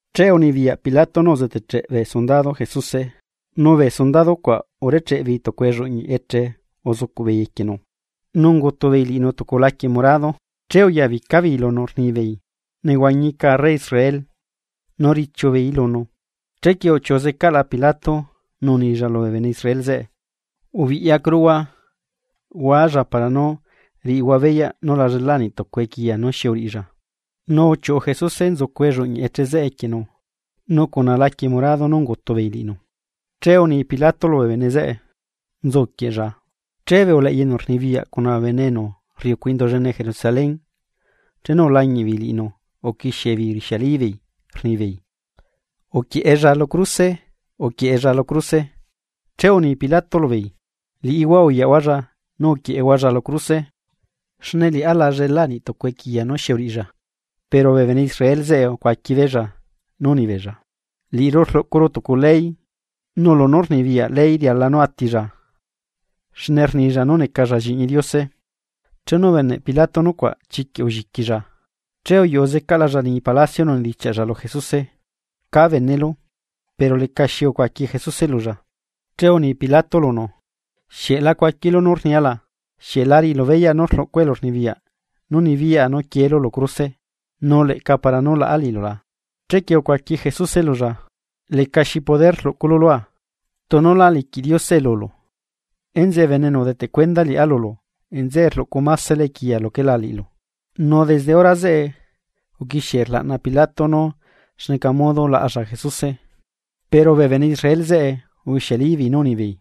Che unibiyaꞌ Pilato nú uzeteꞌcheꞌ bee sundado Jesuse. Nu bee sundado cuaꞌ urecheꞌ beei tucu elluꞌñiꞌ eche uzucuꞌbeei equienu, nu ungutubeei liꞌinu tucu laquie morado. Che uyabica beei lunu rnibeei: ―¡Nehuañi arre Israel! Nu udichiu beei ya beei lunu. Chequie uchiuꞌu zecaꞌla Pilato nu unilla lubee bene Israel zeꞌe: ―Ubiꞌyacuruhua, hualla caꞌa para nú riꞌihua beyaꞌ nú lá llela niꞌ tucu equiya nú xi uriꞌilla. Nu uchiuꞌu Jesuse nzucu elluꞌñiꞌ eche equienu nu nutunu laquie morado nú ungutubeei liꞌinu. Che uni Pilato lubee bene zeꞌe: ―¡Nzuquieꞌlla! Che bee uleꞌya enu rnibiyaꞌ cuna bee bene enu rriucu Indu llene Jerusalén chenu ulañiꞌ beei liꞌinu uquixie beei rixiali beei rnibeei: ―¡Uquieꞌella lu cruse! ¡Uquieꞌella lu cruse! Che uni Pilato lubeei: ―Liꞌihua uyaꞌhualla nu uquieꞌehualla lu cruse, xne liꞌá la llela niꞌtucu equiya nú xi uriꞌilla. Pero bee bene Israel zeꞌe ucuaqui beella nú unibeella: ―Liꞌiru rluꞌcuru tucu ley, nu lunú rnibiyaꞌ ley riala nú atilla xne rnilla nú necalla lliꞌñi Diose. Chenu ubeneꞌ Pilato nucuaꞌ chiquiꞌ ulliquilla. Che uyuꞌu zecaꞌlalla liñi palacio nu unedichiaꞌlla lu Jesuse: ―¿Cá benelu? Pero lecaxi ucuaqui Jesuse lulla. Che uni Pilato lunu: ―¿Xieꞌ la cuaquilu nú rnia la? ¿Xieꞌ la riꞌilu beyaꞌ nú rluꞌcua elurnibiyaꞌ nú nibiyaꞌa nú quielu lu cruse, nu leꞌca para nú laꞌa liꞌilu la? Chequie ucuaqui Jesuse lulla: ―Lecaxi elurnibiyaꞌ rluꞌculu lua, tunu lá liquiꞌ Diosee lulu, enzeꞌe bene enu udeteꞌ cuenda liꞌá lulu nzeꞌe rluꞌcu masela equiya luquela liꞌilu. Nu desde hora zeꞌe, uquixie rlaꞌna Pilato nú xneca modo laꞌalla Jesuse, pero bee bene Israel zeꞌe ubixialíbeei nú unibeei: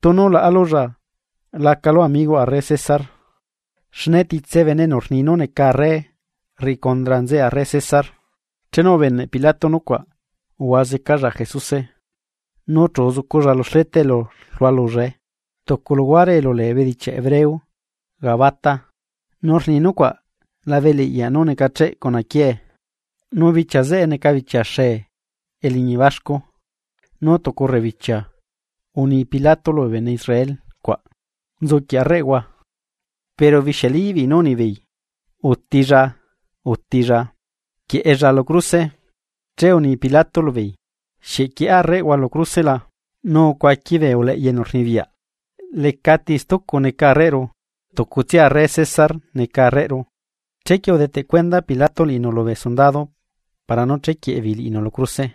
―¡Tunu laꞌalulla lacalu amigoꞌ arre César! ¡Xne titse bene enu rni nú neca arre, rriꞌi condra nzeꞌe arre César! Chenu ubeneꞌ Pilato nucuaꞌ uhua zecalla Jesuse eleꞌyaꞌ ante lubee bene zeꞌe nu chu uzuculla lu xleta elu rlualullae, tucu luhuare elu lee bedichiaꞌ hebreo Gabata, nu rni nucuaꞌ labe eleꞌyaꞌ nú necacheꞌ cuna quiee. Nu bichia zeꞌe neca bichia xee eliñi baxcu, nu tucu rebibichia, uni Pilato lubee bene Israel cuaꞌ: ―¡Nzuquieꞌ arreꞌhua! Pero ubixialíbeei nú unibeei: ―¡Utilla! ¡Utilla! ¡Quieꞌella lu cruse! Che uni Pilato lubeei: ―¿Xieꞌ quieꞌa arreꞌhua lu cruse la? Nu ucuaqui bee uleꞌya enu rnibiyaꞌ: ―Lecati stucu neca arreꞌru, tucutsia arre César neca arreꞌru. Chequie udeteꞌ cuenda pilato liꞌinu lubee sundado para nú chequieꞌe beei liꞌinu lu cruse.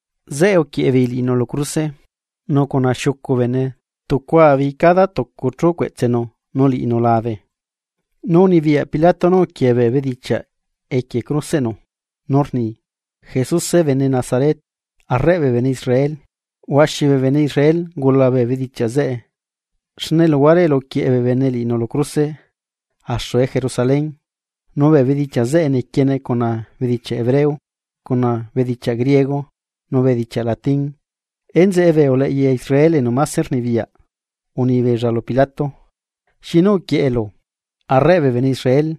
Zeꞌe uquieꞌebeei liꞌinu lu cruse, nu cuna xiucu bene tucua beei cada tucu chú cueꞌtsenu nu liꞌinu labe. Nu unibiyaꞌ Pilato nú uquiee bee bedichiaꞌ equie cruseꞌnu nú rni: “Jesuse bene Nazaret, Arreꞌ bee bene Israel.” Huaxi bee bene Israel ungula bee bedichiaꞌ zeꞌe xne luhuare elu uquieꞌe bee bene liꞌinu lu cruse axue Jerusalén, nu bee bedichiaꞌ zeꞌe nequiene cuna bedichiaꞌ hebreo, cuna bedichiaꞌ griego nu bedichiaꞌ latín. Enzeꞌe bee uleꞌya Israel enu máse rnibiyaꞌ uni beella lu Pilato: ―Xinu uquieꞌelu: “Arreꞌ bee bene Israel”,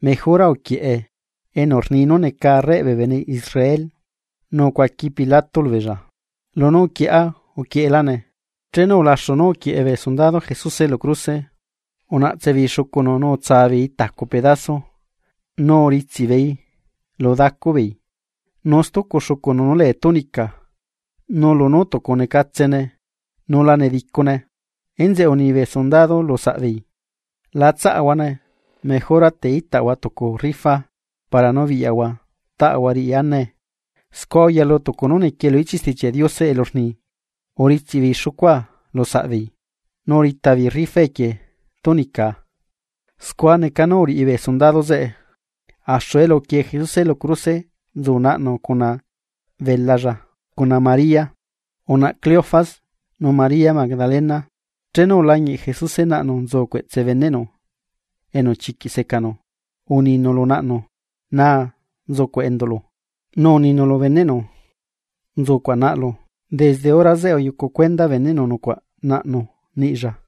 mejora uquieꞌe: “Enu rni nú neca Arreꞌ bee bene Israel.” Nu ucuaqui Pilato lubeella: ―Lunú uquieꞌa, uquieꞌelane. Chenu ulaxu nú uquieꞌe bee sundado Jesuse lu cruse, unaꞌtsebeei xucunu nu utsabeei tacu pedaso xucunu nu uritsiꞌbeei xucunu lu dacubeei. Nu stucu xucunu nú lee túnica nu lunú tucunecatsene nu la nedicune, enzeꞌe uni bee sundado lusaꞌbeei: ―La tsaꞌahuane, mejora te itaꞌahua tucu rifa para nú biꞌyaꞌahua taꞌahua riꞌi anae. Scua uyalu tucu nú niquie lu ichiꞌ Stichiaꞌ Diose elu rni: “Uditsiꞌbeei xucua lusaꞌbeei, nu urita beei rifa equie túnicaa.” Scua neca nú uriꞌi bee sundado zeꞌe. Axu elu uquie Jesuse lu cruse nzu naꞌnu cuna belalla, cuna María, unaꞌa Cleofas, nu María Magdalena. Chenu ulañiꞌ Jesuse naꞌnu nzu cueꞌtse beneꞌnu enu chiquiꞌ secanu, uninu lu naꞌnu: ―Naa nzucuaꞌ enduꞌlu: Nu uninu lu beneꞌnu: ―Nzucuaꞌ naꞌlu. Desde hora zeꞌe uyucu cuenda beneꞌnu nucuaꞌ naꞌnu niꞌlla.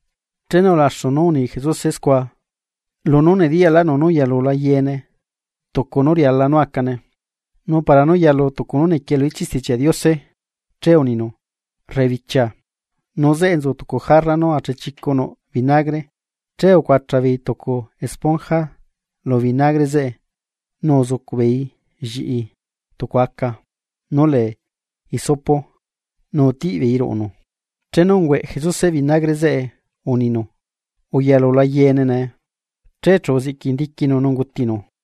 Chenu ulaxu nú uni Jesuse scua lunú nediyaꞌlaꞌnu nú uyalula yeene tucu nú riala nú acane. Nu para nú yalu tucu nú nequie lu ichiꞌ Stichiaꞌ Diose, che uninu: ―Rebichia. Nu zeꞌe nzu tucu jarra nú achechicu nuꞌ vinagre, che ucuacha beei tucu esponja lu vinagre zeꞌe nu uzucuꞌ beeii lliꞌi tucu aca nú lee hisopo, nu utiꞌbeeii ruꞌunu. Chenu ungüeꞌ Jesuse vinagre zeꞌe, uninu: ―Uyalula yeene nee. Che chu uziꞌquindiquinu nu ungutinu.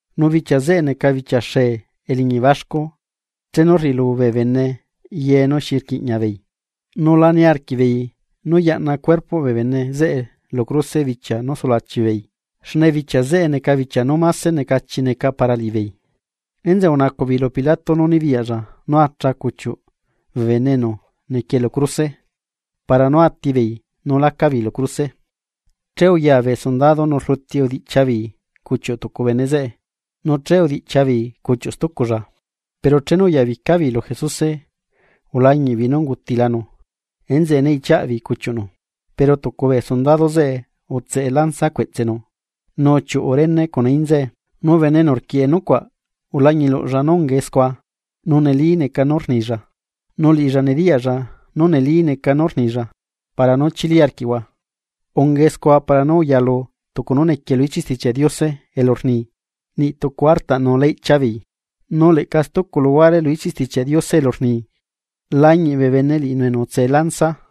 Nu bichia zeꞌe neca bichia xee eliñi baxcu chenu rriꞌilu bee bene ye nú xi quiꞌñiabeei, nu la niarquiꞌbeei nú yaꞌna cuerpoꞌ bee bene zeꞌe lu cruse bichia nú sulachi beei, xne bichia zeꞌe neca bichia nú máse necachi neca para liꞌibeei, enzeꞌe unacuꞌbeei lu Pilato nú nibiyaꞌlla nú acha cuchiuꞌ bee bene enu nequie lu cruse enu nehuañiscaꞌ para nú atibeei nu laca beei lu cruse. Che uyaa bee sundado nu rluti udiꞌchia beei cuchiuꞌ tucu bene zeꞌe nu che udiꞌchia beei cuchiuꞌ stuculla. Pero chenu uyabica beei lu Jesuse ulañiꞌbeei nú ungutilanu. Enzeꞌe ne iꞌchiaꞌbeei cuchiuꞌnu. Pero tucu bee sundado zeꞌe utseꞌe lanza cueꞌtsenu, nu uchiuꞌu rene cuna inza cueꞌtsenu. Nu bene enu rquieꞌe nucuaꞌ ulañiluꞌlla nú ungae scua, nu neli neca nú rnilla, nu liꞌilla nediyaꞌlla nú neli neca nú rnilla para nú chili arquiꞌhua. Ungae scua para nú uyalu tucu nú nequie lu ichiꞌ Stichiaꞌ Diose elu rni: “Niꞌ tucu artaꞌnu lá iꞌchia beei.” Nu leꞌca stucu luhuare lu ichiꞌ Stichiaꞌ Diose elu rni: “Lañiꞌ bee bene liꞌinu enu utsee lanza.”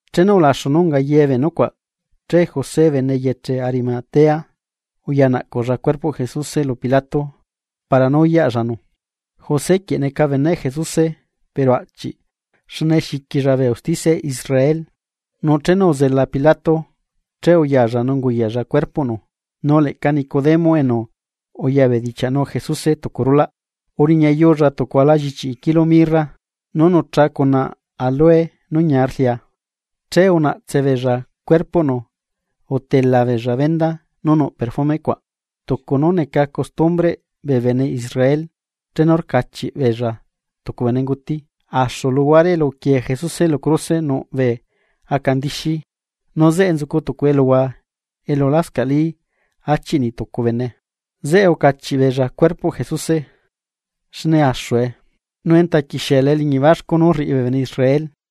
Chenu ulaxu nú unga ye bee nucuaꞌ che José bene eyeche Arimatea uyanaꞌcuꞌlla cuerpoꞌ Jesuse lu Pilato para nú uyaꞌllanu. José quieꞌ neca beneꞌ Jesuse pero aꞌchiꞌ xne xiquilla bee usticia Israel. Nu chenu uzela Pilato, che uyalla nu unguyaꞌlla cuerpoꞌnu. Nu leꞌca Nicodemo enu uyabedichiaꞌnu Jesuse tucu rulaꞌ, uriñayulla tucu ala llichiꞌi kilo mirra nú nucha cuna áloe nú ñia rlia. Che unaꞌtse beella cuerpoꞌnu utelabeella venda nú nuꞌ perfume, tucu nú neca costumbreꞌ bee bene Israel chenu rcachiꞌ beella tucu benenguti. Axu luhuare elu uquiee Jesuse lu cruse nuꞌ bee aca ndixí, nu zeꞌe nzucu tucu eluhua elu lascaꞌlí achiꞌ nitucu bene, zeꞌe ucachiꞌ beella cuerpoꞌ Jesuse xne axue, nu enta quixiela eliñi baxcu nú rriꞌi bee bene Israel.